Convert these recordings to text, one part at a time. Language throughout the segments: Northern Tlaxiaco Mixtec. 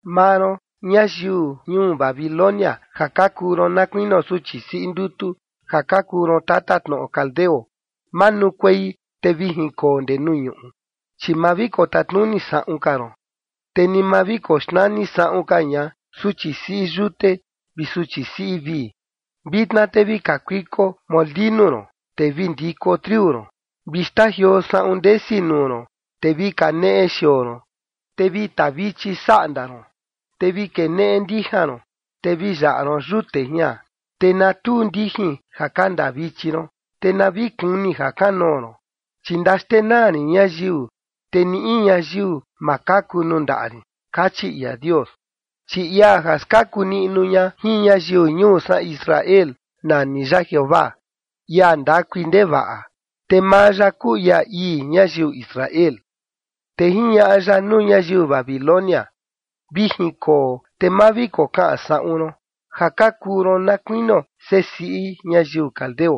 “Maa ron, ñayiu ñuu Babilonia ja ka kuu ron na kuinio suchi siꞌi ndutu, ja ka kuu ron tatatnoꞌo caldeo, manukuei te vi jinkoo ndee nuu ñuꞌu, chi ma vi kotatnuni saꞌun ka ron, te ni ma vi koxnani saꞌun ka ña suchi siꞌi yute vi suchi siꞌi vii. Vitna te vi kakuiko molinu ron, te vi ndiko triu ron, vi xtajioo saꞌun ndesi nuu ron, te vi kaneꞌe xioo ron, te vi tavichi saꞌnda ron, te vi keneꞌe ndijan ron, te vi yaꞌa ron yute jian. Te na tuu ndijin ja ka ndaa vichi ron, te na vi kuni jakanoo ron, chi ndaxtenaa rin ñayiu, te ni in ñayiu ma kaku nuu ndaꞌa rin”, kachi ia Dios. Chi ia ja skaku niꞌnu ña jin ñayiu ñuu san Israel, nani ya Jeovaa, ia ndakui ndevaꞌa, te maa ya kuu ia ii ñayiu Israel. Te jiñaꞌa ya nuu ñayiu Babilonia: “Vi jinkoo te ma vi kokaꞌan saꞌun ron, ja ka kuu ron na kuinio sesiꞌi ñayiu caldeo,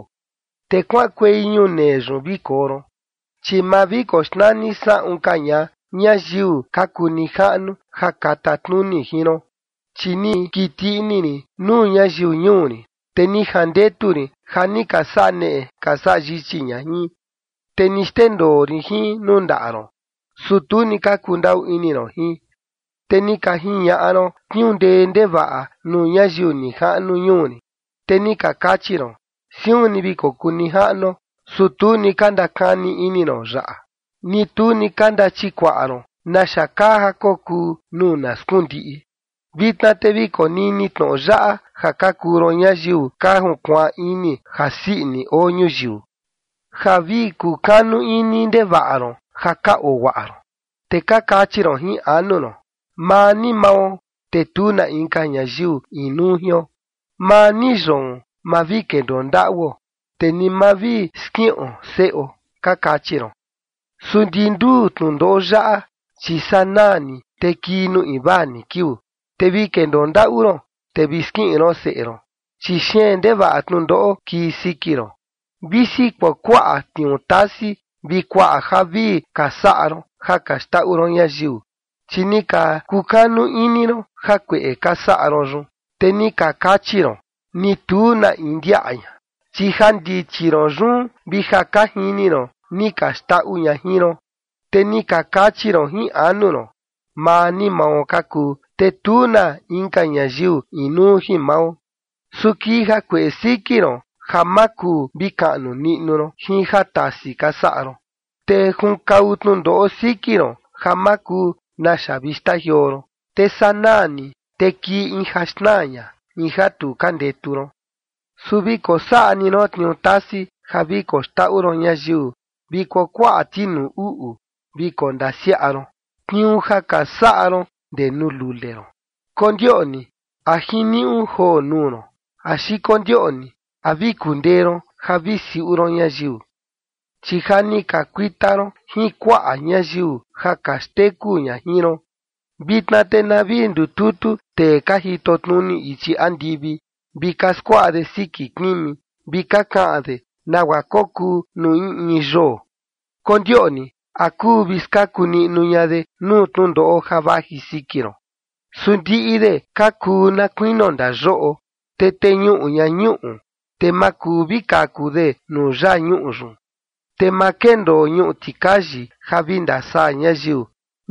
te kuaꞌankuei ñunee yun vi koo ron, chi ma vi koxnani saꞌun ka ña ñayiu ka kuu nijaꞌnu ja ka tatnuni jin ron. Chi ni kiti ini rin nuu ñayiu ñuu rin, te ni jandetu rin ja ni ka saꞌa neꞌe ka saꞌa yichi ña jin, te ni xndendoo rin jin nuu ndaꞌa ron. Su tu ni ka kundaꞌu ini ron jin, te ni ka jiñaꞌa ron tniuu ndee ndevaꞌa nuu ñayiu nijaꞌnu ñuu rin. Te ni ka kachi ron: Siun ni vi kokuu nijaꞌnuo. Su tu ni ka ndakani ini ron yaꞌa, ni tu ni ka ndachikuaꞌa ron naxa kaa ja kokuu nuu na skundiꞌi. Vitna te vi konini tnoꞌo yaꞌa, ja ka kuu ron ñayiu ka junkuaan ini jasii ini oo ñuyiu, ja vi ka kukanu ini ndevaꞌa ron ja ka oo guaꞌa ron, te ka kachi ron jin anu ron: Maa ni mao te tu na inka ñayiu inuu jion. Maa ni yoon ma vi kendoo ndaꞌuo, te ni ma vi skiꞌon seꞌo, ka kachi ron. Su ndi nduu tnundoꞌo yaꞌa, chi sanaa ni te kii nuu invaa ni kiuu, te vi kendoo ndaꞌu ron, te vi skiꞌin ron seꞌe ron. Chi xeen ndevaꞌa tnundoꞌo kii siki ron, visi kuakuaꞌa tniuu tasi vi kuaꞌa javii ka saꞌa ron ja ka xndaꞌu ron ñayiu. Chi ni ka kukanu ini ron jakueꞌe ka saꞌa ron yun, te ni ka kachi ron: Ni tu na in ndiaꞌa ña. Chi jandichi ron yun vi ja ka jini ron ni ka xndaꞌu ña jin ron. Te ni ka kachi ron jin anu ron: Maa ni mao ka kuu, te tu na inka ñayiu inuu jin mao. Su kii jakueꞌe siki ron ja ma kuu vi kaꞌnu niꞌnu ron jin jatasi ka saꞌa ron. Te junkau tnundoꞌo siki ron ja ma kuu naxa vi xtajioo ron. Te sanaa ni, te kii in ja xnaa ña, in ja tu ka ndetu ron. ’Su vi kosaꞌa ni ron tniuu tasi ja vi koxndaꞌu ron ñayiu vi kuakuaꞌa tinuu uꞌu vi kondasiaꞌa ron, tniuu ja ka saꞌa ron ndee nuu lule ron. Kondioꞌni a jiniuꞌu joo nuu ron axi kondioꞌni a vi kundee ron ja vi siuꞌu ron ñayiu. Chi ja ni ka kuita ron jin kuaꞌa ñayiu ja ka xteku ña jin ron. Vitna te na vi ndututu tee ka jitotnuni ichi andivi, vi ka skuaꞌa de siki kimi, vi ka kaꞌan de nagua kokuu nuu in in yoo. Kondioꞌni a kuu vi skaku niꞌnu ña de nuu tnundoꞌo ja vaji siki ron. Su ndiꞌi de ka kuu na kuinio ndayoꞌo, te teñuꞌu ña ñuꞌu, te ma kuu vi kaku de nuu yaa ñuꞌu yun. Te ma kendoo ñuꞌu tikayi ja vi ndasaa ñayiu,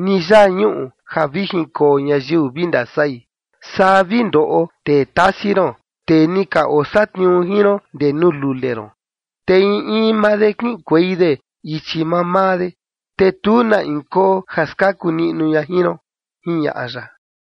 ni yaa ñuꞌu ja vi jinkoo ñayiu vi ndasai. Saa vi ndoꞌo tee tasi ron, tee ni ka osatniuu jin ron ndee nuu lule ron. Te in in maa de kiꞌinkuei de ichi mamaa de, te tu na in koo ja skaku niꞌnu ña jin ron”, jiñaꞌa ya.